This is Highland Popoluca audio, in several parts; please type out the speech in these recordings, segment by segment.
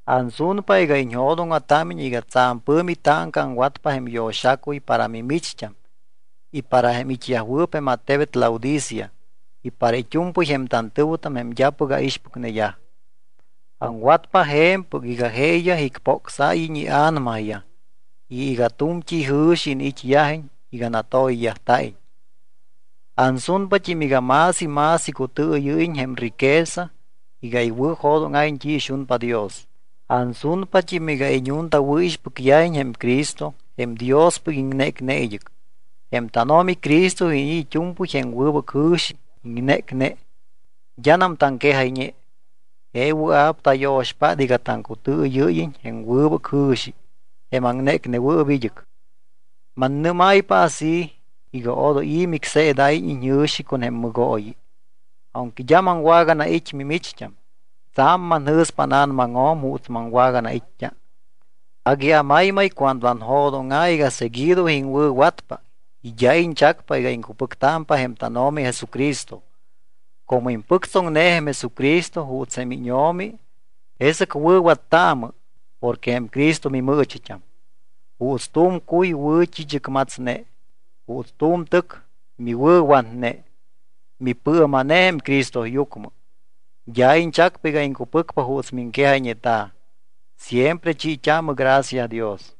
Ansunpa iga iñjo̱dóŋa̱támiñ iga tsa̱m pɨ̱mi táŋca aŋwatpa jém yo̱xacuy para mimicht́am y para jém it́yajwɨɨp jém attebet Laodicea y para it́u̱mpɨy jém tantɨ̱wɨtam jém d́apɨc aixpɨcneyaj. Aŋwatpa je̱mpɨc iga jeeyaj icpocsáyiñ ia̱namayaj y iga tu̱mt́i jɨ̱xi iniit́yajiñ iga natoyyajta̱iñ. Ansunpat́im iga más y más icutɨɨyɨ́yiñ jém riqueza iga iwɨ̱jo̱dóŋa̱iñ t́i ixunpa Dios. Ansunpat́im iga iñuntawɨ̱ixpɨcyajiñ jém Cristo jém Diospɨc iŋnécne id́ɨc. Jém tánO̱mi Cristo iniit́ it́u̱mpɨy jém wɨbɨc jɨ̱xi iŋnécne, d́anam taŋquejayñe. Je wɨa̱p tayo̱xpát iga taŋcutɨɨyɨ́yiñ jém wɨbɨc jɨ̱xi, jém aŋnécnewɨɨp id́ɨc. Mannɨ́máypa así iga odoy i̱ micseedáyiñ iñjɨ̱xi con jém mɨgooyi. Aunque d́a maŋwaganait́ mimicht́am, tsa̱m manjɨ̱spa ána̱namaŋjo̱m juuts maŋwaganait́t́a. Agui amaymay cuando anjo̱dóŋa̱ iga seguido iŋwɨ̱watpa y d́a iñchacpa iga iŋcupɨctámpa jém tánO̱mi Jesucristo. Como impɨctsoŋne jém Jesucristo juuts jém íñO̱mi, jesɨc wɨ̱wattaamɨ porque jém Cristo mimɨɨchit́am. Juuts tu̱m cuy miwɨ̱t́i̱chɨcmatsne, juuts tu̱m tɨc miwɨ̱watne, mipɨɨma̱ne jém Cristoyucmɨ. D́a iñchacpa iga iŋcupɨcpa juuts miŋquejayñeta̱. Siempre chiit́aamɨ gracia Dios.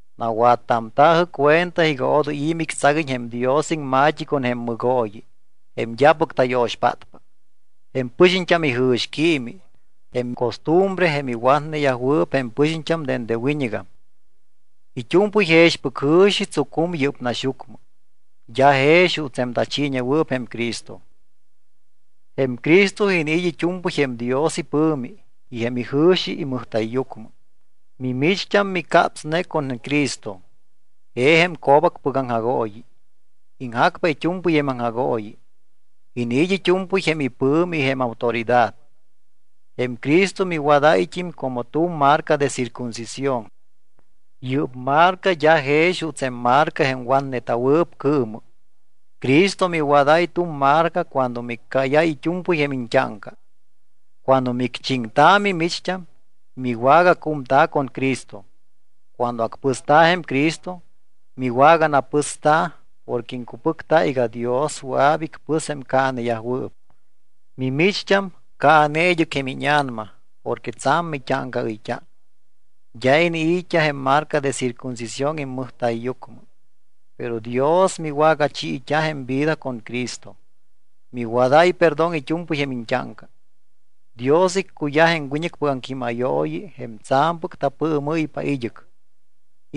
Nawattamta̱jɨ cuenta iga odoy i̱ mictsaguiñ jém Dios iŋma̱t́i con jém mɨgooyi, jém d́apɨc tayo̱xpátpa, jém pɨxiñt́am ijɨ̱xquiimi, jém costumbre jém iwatneyajwɨɨp jém pɨxiñt́am dende wiñɨgam. It́u̱mpɨy jexpɨc jɨ̱xi tsucum yɨ́p naxyucmɨ, d́a jex juuts jém tachiiñewɨɨp jém Cristo. Jém Cristo iniit́ it́u̱mpɨy jém Dios ipɨ̱mi y jém ijɨ̱xi imɨjta̱yyucmɨ. Mimicht́am micapsne con Cristo. Je jém co̱bacpɨc aŋjagooyi. Iŋjacpa it́u̱mpɨy jém aŋjagooyi, iniit́ it́u̱mpɨy jém ipɨ̱mi y jém autoridad. Jém Cristo miwadáyt́im como tu̱m marca de circuncisión. Yɨ́p marca d́a jex juuts jém marca jém watneta̱wɨɨp cɨɨmɨ. Cristo miwadáy tu̱m marca cuando miccáyáy it́u̱mpɨy jém iñt́áŋca. Cuando micchiŋta̱ mimicht́am, miwagacumta̱ con Cristo. Cuando acpɨsta̱ jém Cristo, miwaganapɨsta̱ porque iŋcupɨcta iga Dios wɨa̱p icpɨs jém caaneyajwɨɨp. Mimicht́am caane id́ɨc jém íña̱nama porque tsa̱m mit́áŋcaɨyt́a. D́a iniit́t́a jém marca de circuncisión immɨjta̱yyucmɨ. Pero Dios miwagachiit́a jém vida con Cristo. Miwadáy perdón it́u̱mpɨy jém iñt́áŋca. Dios iccuyaj jém wiñɨcpɨc aŋquímayooyi jém tsa̱mpɨc tapɨɨmɨ́ypa id́ɨc.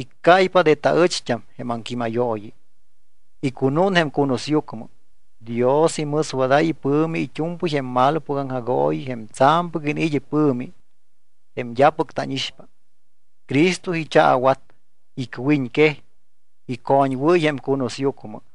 Iccáypa de taɨcht́am jém aŋquímayooyi, icunún jém cunusyucmɨ. Dios imɨswadáy ipɨ̱mi it́u̱mpɨy jém malopɨc aŋjagooyi jém tsa̱mpɨc iniit́ ipɨ̱mi, jém d́apɨc tánixpa. Cristo ichaawat, icwiñquej, icoñwɨ́y jém cunusyucmɨ.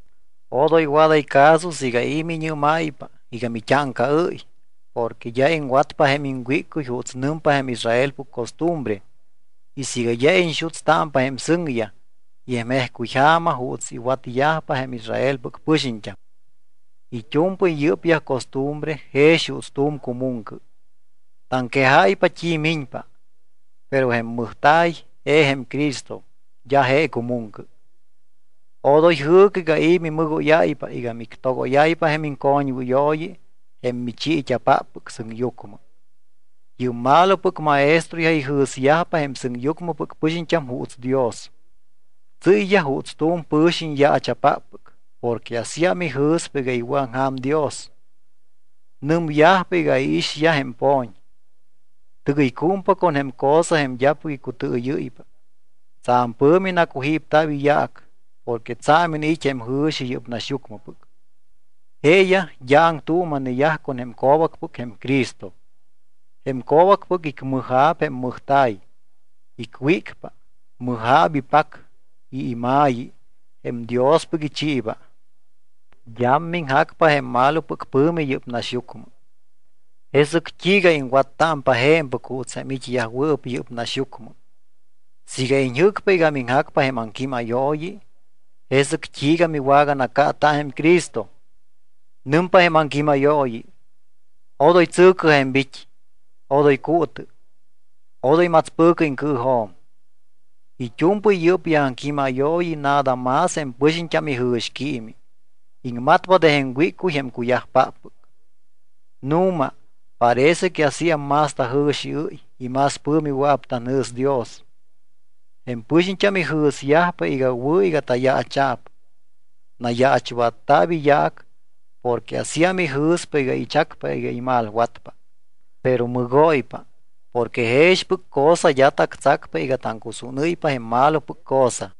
Odoy waday caso siiga i̱ miñɨ́máypa iga mit́áŋcaɨ́y porque d́a iŋwatpa jém iŋwíccuy juuts nɨmpa jém Israelpɨc costumbre y siiga d́a iñxutstámpa jém sɨŋyaj y jém jejcuy ja̱ma juuts iwatyajpa jém Israelpɨc pɨxiñt́am. It́u̱mpɨy yɨ́pyaj costumbre jex juuts tu̱m cumuŋcɨ, taŋquejáypa t́i miñpa, pero jém mɨjta̱y je jém Cristo, d́a je cumuŋcɨ. Odoy jɨɨcɨ iga i̱ mimɨgóyáypa y mictogóyáypa jém iŋcoñwɨyooyi jém michiit́a̱páppɨc sɨŋyucmɨ. Yɨ́p malopɨc maestroyaj ijɨ̱syajpa jém sɨŋyucmɨpɨc pɨxiñt́am juuts Dios. Tsɨ́yyaj juuts tu̱m pɨ̱xiñ yaacha̱páppɨc porque asíam ijɨ̱spa iga iwɨ̱aŋja̱m Dios. Nɨmyajpa iga iixyaj jém po̱ñ. Tɨgɨycúmpa con jém cosa jém d́apɨc icutɨɨyɨ́ypa. Tsa̱m pɨ̱mi nacujípta̱p iyaac porque tsa̱m iniit́ jém jɨ̱xi yɨ́p naxyucmɨpɨc. Jeeyaj d́a aŋtuuma̱neyaj con jém co̱bacpɨc, jém Cristo. Jém co̱bac icmɨja̱p jém mɨjta̱y, icwícpa. Mɨja̱p ipac y ima̱yi jém Diospɨc ichiiba. D́am miŋjacpa jém malopɨc pɨ̱mi yɨ́p naxyucmɨ. Jesɨc t́iiga iŋwattámpa je̱mpɨc juuts jém it́yajwɨɨp yɨ́p naxyucmɨ. Siiga iñjɨ́cpa iga miŋjacpa jém aŋquímayooyi, ¿jesɨc t́iiga miwaganacaata jém Cristo? Nɨmpa jém aŋquímayooyi: “Odoy tsɨ̱cɨ je̱mbit́, odoy cuutɨ, odoy matspɨ̱cɨ iŋcɨɨjo̱m.” It́u̱mpɨy yɨ́pyaj aŋquímayooyi nada más jém pɨxiñt́am ijɨ̱xquiimi. Iŋmatpa de jém wíccuy jém cuyajpáppɨc. Nu̱ma parece que asíam más tajɨ̱xiɨ́y y más pɨ̱mi wɨa̱p tanjɨ̱s Dios. Jém pɨxiñt́am ijɨ̱syajpa iga wɨ̱ iga tayaacha̱p. Nayaachwatta̱p iyaac porque asíam ijɨ̱spa iga ichacpa iga imalwatpa. Pero mɨgóypa porque jexpɨc cosa d́a tactsacpa iga taŋcusúnɨ́ypa jém malopɨc cosa.